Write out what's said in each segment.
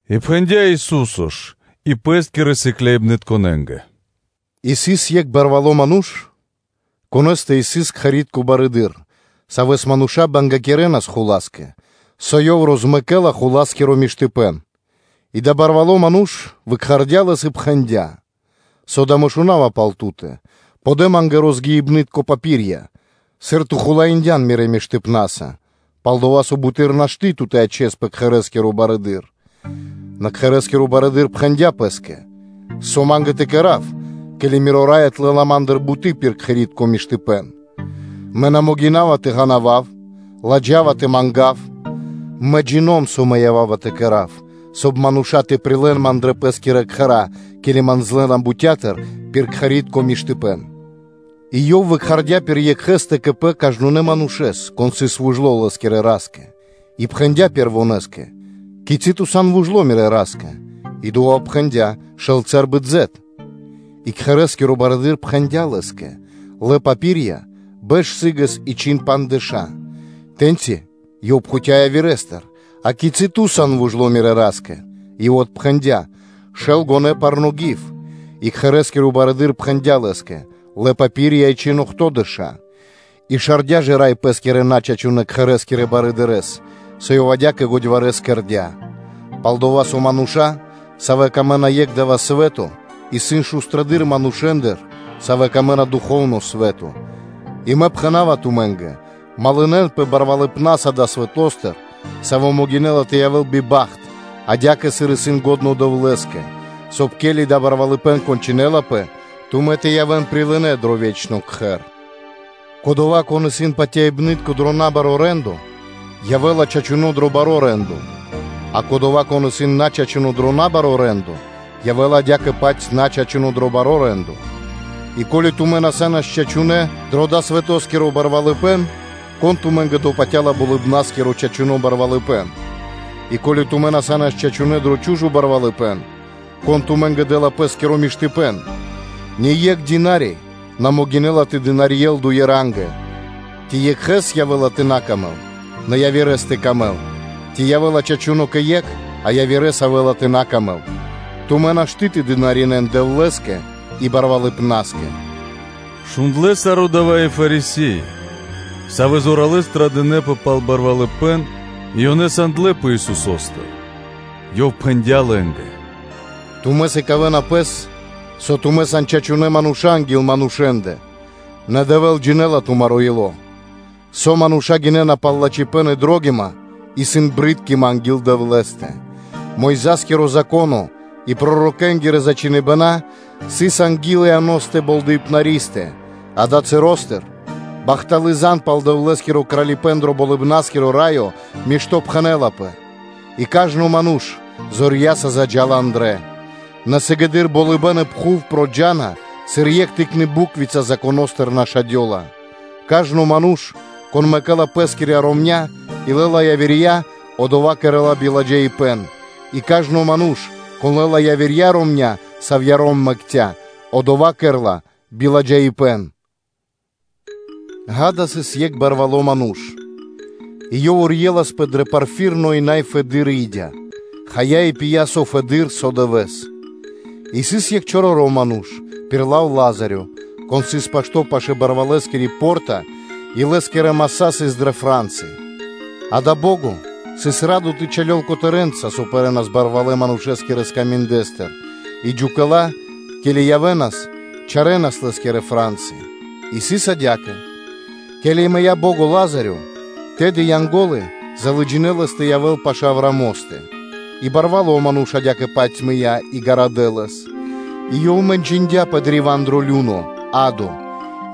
И пхэндя́ Ису́со ж и Пэ́скирэ сыкляибнытконэ́нгэ: “Сыс екх барвало́ ману́ш, конэ́стэ сыс кхэрэ́скиро барыдыро́, савэ́с мануша́ бангякирэнас хула́скэ, со ёв розмэкэлас хуласкиро миштыпэ́н. И адава́ барвало́ ману́ш выкхардя лэс и пхэндя́: ‘Со да мэ шунава пал ту́тэ? Подэ ма́нгэ розгиныбнытко папиря, сыр ту хулаиндян мирэ́ миштыпнаса, пал-дова́ со буты́р ту́кэ нашты́ тэ ячэспэ кхэрэ́скирэ барыдырэ́са.’ Нэ кхэрэ́скиро барыдыро́ пхэндя́ пэ́скэ: ‘Со ма́нгэ тэ кэра́в, ке́ли Миро рай отлэла ма́ндыр буты́ пир кхэри́тко миштыпэ́н? Мэ на могина́ва тэ ґанавав, ладжава тэ мангав. Мэ джино́м (джина́в), со мэ ява́ва тэ кэра́в; соб (кай) мануша́ тэ прилэ́н ман дрэ пэ́скирэ кхэра́, ке́ли ман злэна бутя́тыр пир кхэри́тко миштыпэ́н.’ И ёв выкхардя пир екхэ́стэ кэ пэ кажнонэ́ манушэ́с, кон сыс вужло лэ́скирэ ра́скэ, и пхэндя́ пэрвонэскэ: ‘Кицы́ ту сан вужло мирэ́ ра́скэ?’ И одова́ отпхэндя́: ‘Шэл цэбры (меры) дзэт’ (елеё). И кхэрэ́скиро барыдыро́ пхэндя́ Лэ́скэ: ‘Лэ тыро́ росчхиныбнытко, бэш сы́гэс и чхин пандждэша́’. Тэ́ньци ёв пхуця́ явирэстыр: ‘А кицы́ ту сан вужло мирэ́ ра́скэ?’ И ёв отпхэндя́: ‘Шэл гонэ́ (меры) парно́ гив.’ И кхэрэ́скиро барыдыро́ пхэндя́ лэ́скэ: ‘Лэ тыро́ росчхиныбнытко и чхин охтодэша́’. И шардя ж рай пэ́скирэ начачунэ кхэрэ́скирэ барыдырэ́с, со ёв адя́кэ годьварэс кэрдя́. Пал-дава́ со мануша́, савэ́нгэ исын дро́го екх дава́ свэ́то, исын годэдыр манушэ́ндыр, савэ́нгэ исын дро́го духовно (фаноскиро) свэ́то. И Мэ пхэна́ва тумэ́нгэ: малынэнпэ барвалыпнаса далэ́ свэто́стыр, саво́ могинэ́ла тэ явэ́л биба́хт адя́кэ, сыр исын лачхо́ Дэвлэ́скэ, соб (кай), ке́ли дава́ барвалыпэ́н кончынэлапэ, тумэ́ тэ явэ́н прилынэ́ дро ве́чно кхэр.’” Кодова́, кон исын патяибны́тко дро набаро́ рэ́ндо, явэ́ла чачуно́ дро баро́ рэ́ндо; а кодова́, кон исын начачуно дро набаро́ рэ́ндо, явэ́ла адя́кэ-паць начачуно дро баро́ рэ́ндо. И ко́ли тумэ́ на са́нас чачунэ́ дро далэ́ свэтоскиро барвалыпэ́н, кон тумэ́нгэ допатяла Болыбна́скиро чачуно́ барвалыпэ́н? И ко́ли тумэ́ на са́нас чачунэ́ дро чу́жо барвалыпэ́н, кон тумэ́нгэ дэ́ла пэ́скиро миштыпэ́н? Ние́кх дына́ри (слуга) на могинэ́ла тэ дынарьел дуе рангэ, ци екхэ́с тэ явэ́ла тэ на камэл, нэ явирэ́с тэ камэл, ци явэ́ла чачуно́ кэ екх, а пэ явирэ́стэ явэ́ла тэ дыкхэ́л вучипна́стыр. Тумэ́нгэ нашты́ тэ дынаринэ́н Дэвлэ́скэ и барвалыпнаскэ.” Шундлэ́ саро́ дава́ и Фарисе́и, савэ́ зоралэ́с традынэпэ пал барвалыпэ́н и ёнэ лынэ́ тэ санпэ Исусо́стыр. Ёв пхэндя́ лэ́нгэ: “Тумэ́ сыкавэ́на пэс, со тумэ́ сан чачунэ́ манушэ́нца анги́л манушэ́ндэ, нэ Дэвэ́л джинэ́ла тумаро́ ило́; со мануша́ гинэ́на пал бари паты́в, исын джунгалыпэ́н (брыткима) анги́л Дэвлэ́стэ. Мойза́скиро Зако́но и пророкэ́нгирэ зачхиныбэна сыс анги́л Ианостэ Болдэипнаристэ: далэ́ часостыр бахталы́ зан (звесь) пал Дэвлэ́скиро Кралипэ́н дро Болыбна́скиро Раё миштопхэнэлапэ, и кажно ману́ш зорья́са заджа́ла андрэ́. Нэ сыгэды́р болыбэ́н и пхув проджа́на, сыр екх тыкны буквица (литэрка) Законо́стыр нашадёла. Кажно ману́ш, кон мэкэ́ла пэскирья́ ромня́ и лэ́ла явирья, одова́ кэрэ́ла биладжаипэ́н; и кажно ману́ш, кон лэ́ла явирья, савья́ ром мэкця́, одова́ кэрэ́ла биладжаипэ́н’. “Гада, сыс екх барвало́ ману́ш и ёв урьеласпэ дрэ порфиритко и най фэдыдыр и́дя, хая и пия со фэдэды́р со дывэ́с. И сыс екх чороро́ ману́ш, пир лав Лазарё, кон сыс пашто́ пашы́л барвалэскири по́рта и лэ́скирэ маса́ сыс дрэ фра́нсы, а адава́ бо́го сыс радо тэ чалёл котэрэнца, со пэрэнас барвалэ́ – манушэ́скирэ скаминдэстыр, и джукэла, ке́ли явэ́нас, чарэнас лэ́скирэ фра́нсы. И сыс адя́кэ: ке́ли мыя́ бо́го Лазарё, тэды Янго́лы залыджинэ лэс тэ явэ́л пашы́л Авраамостэ. И барвало́ ману́ш адя́кэ-паць мыя́ и гарадэ́ лэс. И ёв мэнчындяпэ древа́н дро лю́но (адо)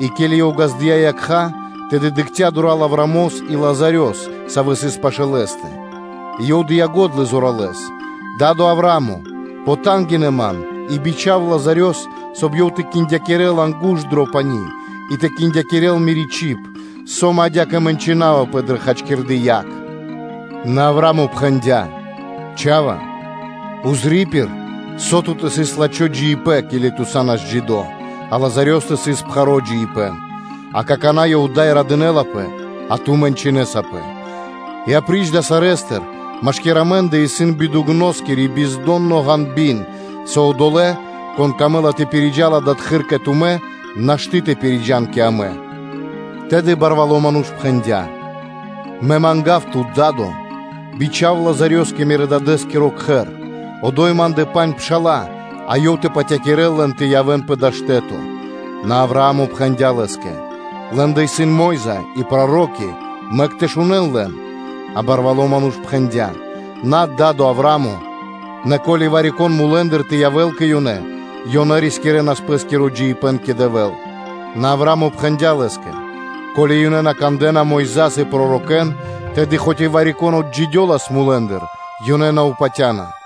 и, ке́ли ёв ґаздыя́ якха́, тэды дыкхця́ дура́л Аврамос и Лазарёс, саво́ сыс пашы́л Лэ́стэ. И ёв дыя́ го́дла зоралэ́с: ‘Да́до, Аврааме, потангинэ ман и бичха́в Лазарёс, соб (кай) ёв тэ киндякирэл ангу́шт дро пани́ и тэ киндякирэл мири́ чиб, со мэ адя́кэ мэнчынавапэ дрэ дая́ хачкирды яг’. Нэ Авра́мо пхэндя́: ‘Чха́ва, пририпир, со ту́тэ сыс лачхо́ джиибэ́н, ке́ли ту са́нас джидо́, а Лазарёстэ сыс пхаро́ джиибэ́н. А какана́ ёв ада́й радынэ́лапэ, а ту мэнчынэсапэ. И апри́ч дава́ саро́, машки́р амэ́ндэ исын бидугноскиро пропэрибэн, со одолэ́, кон камэ́ла тэ пириджал адатхы́р кэ тумэ́, нашты́ тэ пириджан кэ амэ.’ Тэды барвало́ ману́ш пхэндя́: ‘Мэ мангав тут, Да́до, тэ бичхавэл Лазарёс кэ Мирэ́-дадэ́скиро кхэр; одо́й ма́ндэ пандж пша́ла, а ёв тэ патякирэл лэн тэ на явэ́н пэ дава́ штэ́то тэ мэнчынэнпэ.’ Нэ Авраа́мо пхэндя́ лэ́скэ: ‘Лэ́ндэ исын Мо́йза и проро́ки: мэк тэ шунэ́н лэн’. А барвало́ ману́ш пхэндя́: ‘Над, Да́до Аврааме! Нэ ко́ли вари-кон мулэ́ндыр тэ явэ́л кэ ёнэ, ёнэ рискирэнас пэ́скиро джиибэ́н кэ Дэвэ́л’. Нэ Авраа́мо пхэндя́ лэ́скэ: ‘Ко́ли ёнэ на кандэ́на Мойза́с и пророкэ́н, тэды хоць и вари-кон отджидёлас мулэ́ндыр, ёнэ на упатянас.’”